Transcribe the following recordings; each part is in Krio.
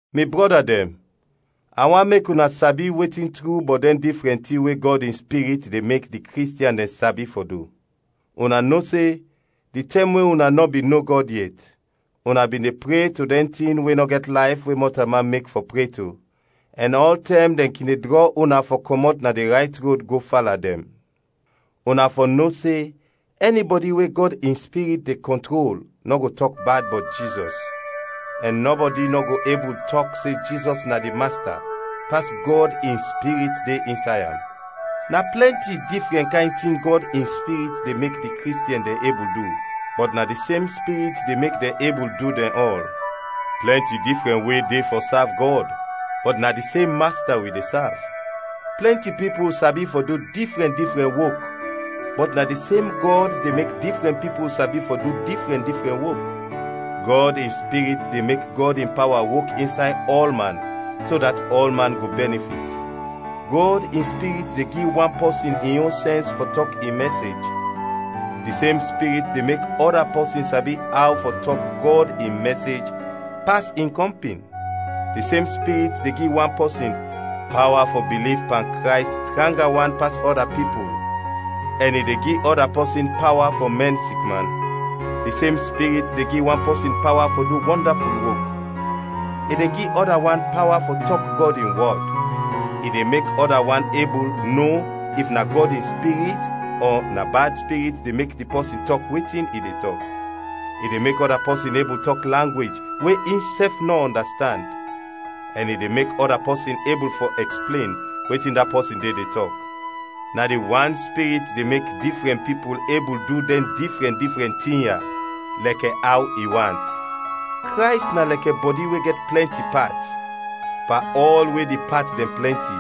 Mi brɔda dɛn, a want mek una sabi wetin tru bɔt dɛn difrɛn tin we Gɔd in Spirit de mek di Kristiɛn dɛn sabi fɔ du. Una no se di tɛm we una nɔ bin no Gɔd yet, una bin de pre to dɛn tin we nɔ gɛt layf we mɔtalman mek fɔ pre to, ɛn ɔltɛm dɛn kin de drɔ una fɔ kɔmɔt na di rayt rod go fala dɛn. Una fɔ no se ɛnibɔdi we Gɔd in Spirit de kɔntrol nɔ go tɔk bad bɔt Jizɔs! Ɛn nɔbɔdi nɔ go ebul tɔk se Jizɔs na di Masta pas Gɔd in Spirit de insay am. Na plɛnti difrɛn kayn tin Gɔd in Spirit de mek di Kristiɛn dɛn ebul du, bɔt na di sem Spirit de mek dɛn ebul du dɛn ɔl. Plɛnti difrɛn we de fɔ sav Gɔd, bɔt na di sem Masta wi de sav. Plɛnti pipul sabi fɔ du difrɛn difrɛn wok, bɔt na di sem Gɔd de mek difrɛn pipul sabi fɔ du difrɛn difrɛn wok. Gɔd in Spirit de mek Gɔd in pawa wok insay ɔlman so dat ɔlman go bɛnifit. Gɔd in Spirit de gi wan pɔsin in yon sɛns fɔ tɔk in mɛsej, di sem Spirit de mek ɔda pɔsin sabi aw fɔ tɔk Gɔd in mɛsej pas in kɔmpin. Di sem Spirit de gi wan pɔsin pawa fɔ biliv pan Krays tranga wan pas ɔda pipul, ɛn i de gi ɔda pɔsin pawa fɔ mɛn sikman. Di sem Spirit de gi wan pɔsin pawa fɔ du wɔndaful wok; i de gi ɔda wan pawa fɔ tɔk Gɔd in wɔd; i de mek ɔda wan ebul no if na Gɔd in Spirit ɔ na bad spirit de mek di pɔsin tɔk wetin i de tɔk; i de mek ɔda pɔsin ebul tɔk langwej we insɛf nɔ ɔndastand; ɛn i de mek ɔda pɔsin ebul fɔ ɛksplen wetin da pɔsin de de tɔk. Na di wan Spirit de mek difrɛn pipul ebul du dɛn difrɛn difrɛn tin ya, lɛkɛ aw i want. Krays na lɛkɛ bɔdi we gɛt plɛnti pat; pan ɔl we di pat dɛn plɛnti,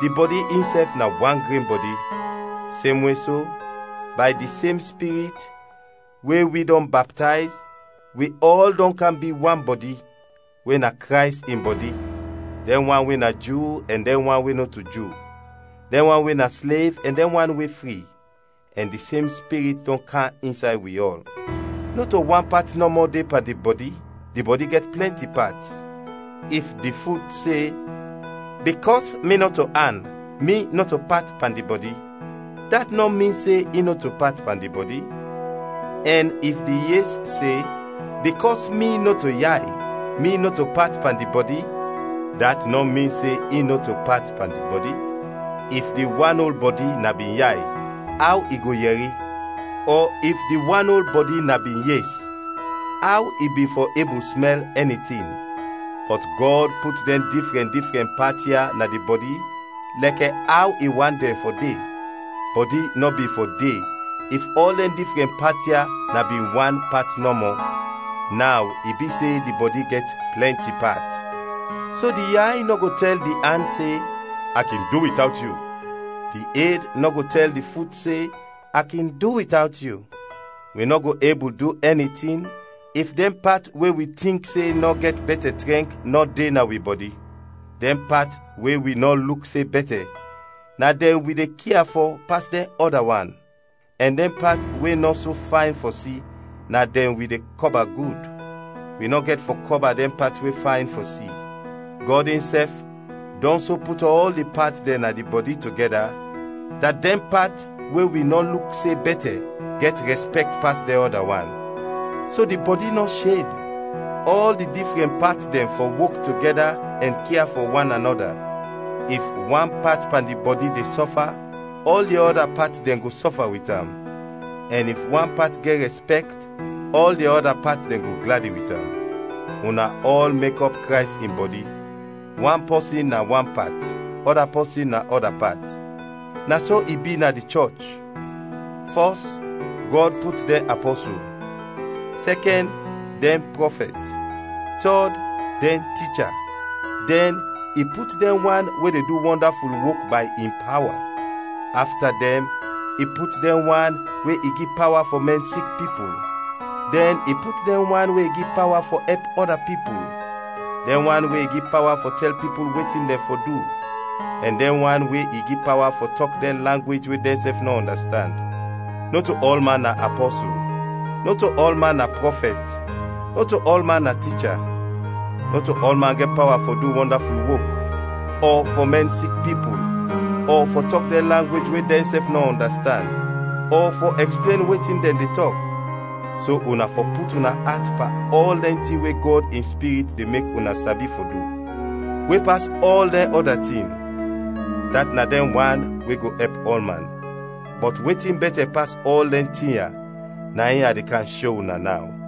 di bɔdi insɛf na wan gren bɔdi. Semwe so, bay di sem Spirit, we wi dɔn baptayz, wi ɔl dɔn kam bi wan bɔdi, we na Krays in bɔdi; dɛn wan we na Ju ɛn dɛn wan we nɔto Ju, dɛn wan we na slev, ɛn dɛn wan we fri; ɛn di sem Spirit dɔn kam insay wi ɔl. Nɔto wan pat nɔmɔ de pan di bɔdi, di bɔdi gɛt plɛnti pat. If di fut se, “Bikɔs mi nɔto an, mi nɔto pat pan di bɔdi,” dat nɔ min se in nɔto pat pan di bɔdi. Ɛn if di yes se, “Bikɔs mi nɔto yay, mi nɔto pat pan di bɔdi,” dat nɔ min se in nɔto pat pan di bɔdi. If di wan ol bɔdi na bin yay, aw i go yɛri? Ɔ if di wan ol bɔdi na bin yes, aw i bin fɔ ebul smɛl ɛni tin? Bɔt Gɔd put dɛn difrɛn difrɛn pat ya na di bɔdi lɛkɛ aw i want dɛn fɔ de. Bɔdi nɔ bin fɔ de if ɔl dɛn difrɛn pat ya na bin wan pat nɔmɔ. Naw i bi se di bɔdi gɛt plɛnti pat. So di yay nɔ go tɛl di an se, “A kin du witawt yu.” Di ed nɔ go tɛl di fut se, “A kin du witawt yu.” Wi nɔ go ebul du ɛni tin if dɛn pat we wi tink se nɔ gɛt bɛtɛ trɛnk nɔ de na wi bɔdi; dɛn pat we wi nɔ luk se bɛtɛ, na dɛn wi de kia fɔ pas dɛn ɔda wan; ɛn dɛn pat we nɔ so fayn fɔ si, na dɛn wi de kɔba gud; wi nɔ gɛt fɔ kɔba dɛn pat we fayn fɔ si. Gɔd insɛf dɔn so put ɔl di pat dɛn na di bɔdi togɛda, dat dɛn pat we wi nɔ luk se bɛtɛ gɛt rɛspɛkt pas dɛn ɔda wan. So di bɔdi nɔ sheb, ɔl di difrɛn pat dɛn fɔ wok togɛda ɛn kia fɔ wananɔda. If wan pat pan di bɔdi de sɔfa ɔl di ɔda pat dɛn go sɔfa wit am, ɛn if wan pat gɛt rɛspɛkt, ɔl di ɔda pat dɛn go gladi wit am. Una ɔl mek ɔp Krays in bɔdi, wan pɔsin na wan pat, ɔda pɔsin na ɔda pat. Na so i bi na di chɔch: fɔs, Gɔd put dɛn apɔsul; sɛkɛn, dɛn prɔfɛt; tɔd, dɛn ticha; dɛn i put dɛn wan we de du wɔndaful wok bay in pawa; afta dɛn i put dɛn wan we i gi pawa fɔ mɛn sik pipul; dɛn i put dɛn wan we i gi pawa fɔ ɛp ɔda pipul; dɛn wan we i gi pawa fɔ tɛl pipul wetin dɛn fɔ du; ɛn dɛn wan we i gi pawa fɔ tɔk dɛn langwej we dɛnsɛf nɔ ɔndastand. Nɔto ɔlman na apɔsul, nɔto ɔlman na prɔfɛt, nɔto ɔlman na ticha. Nɔto ɔlman gɛt pawa fɔ du wɔndaful wok, ɔ fɔ mɛn sik pipul, ɔ fɔ tɔk dɛn langwej we dɛnsɛf nɔ ɔndastand, ɔ fɔ ɛksplen wetin dɛn de tɔk. So una fɔ put una at pan ɔl dɛn tin we Gɔd in Spirit de mek una sabi fɔ du we pas ɔl dɛn ɔda tin, dat na dɛn wan we go ɛp ɔlman. Bɔt wetin bɛtɛ pas ɔl dɛn tin ya na in a de kam sho una naw.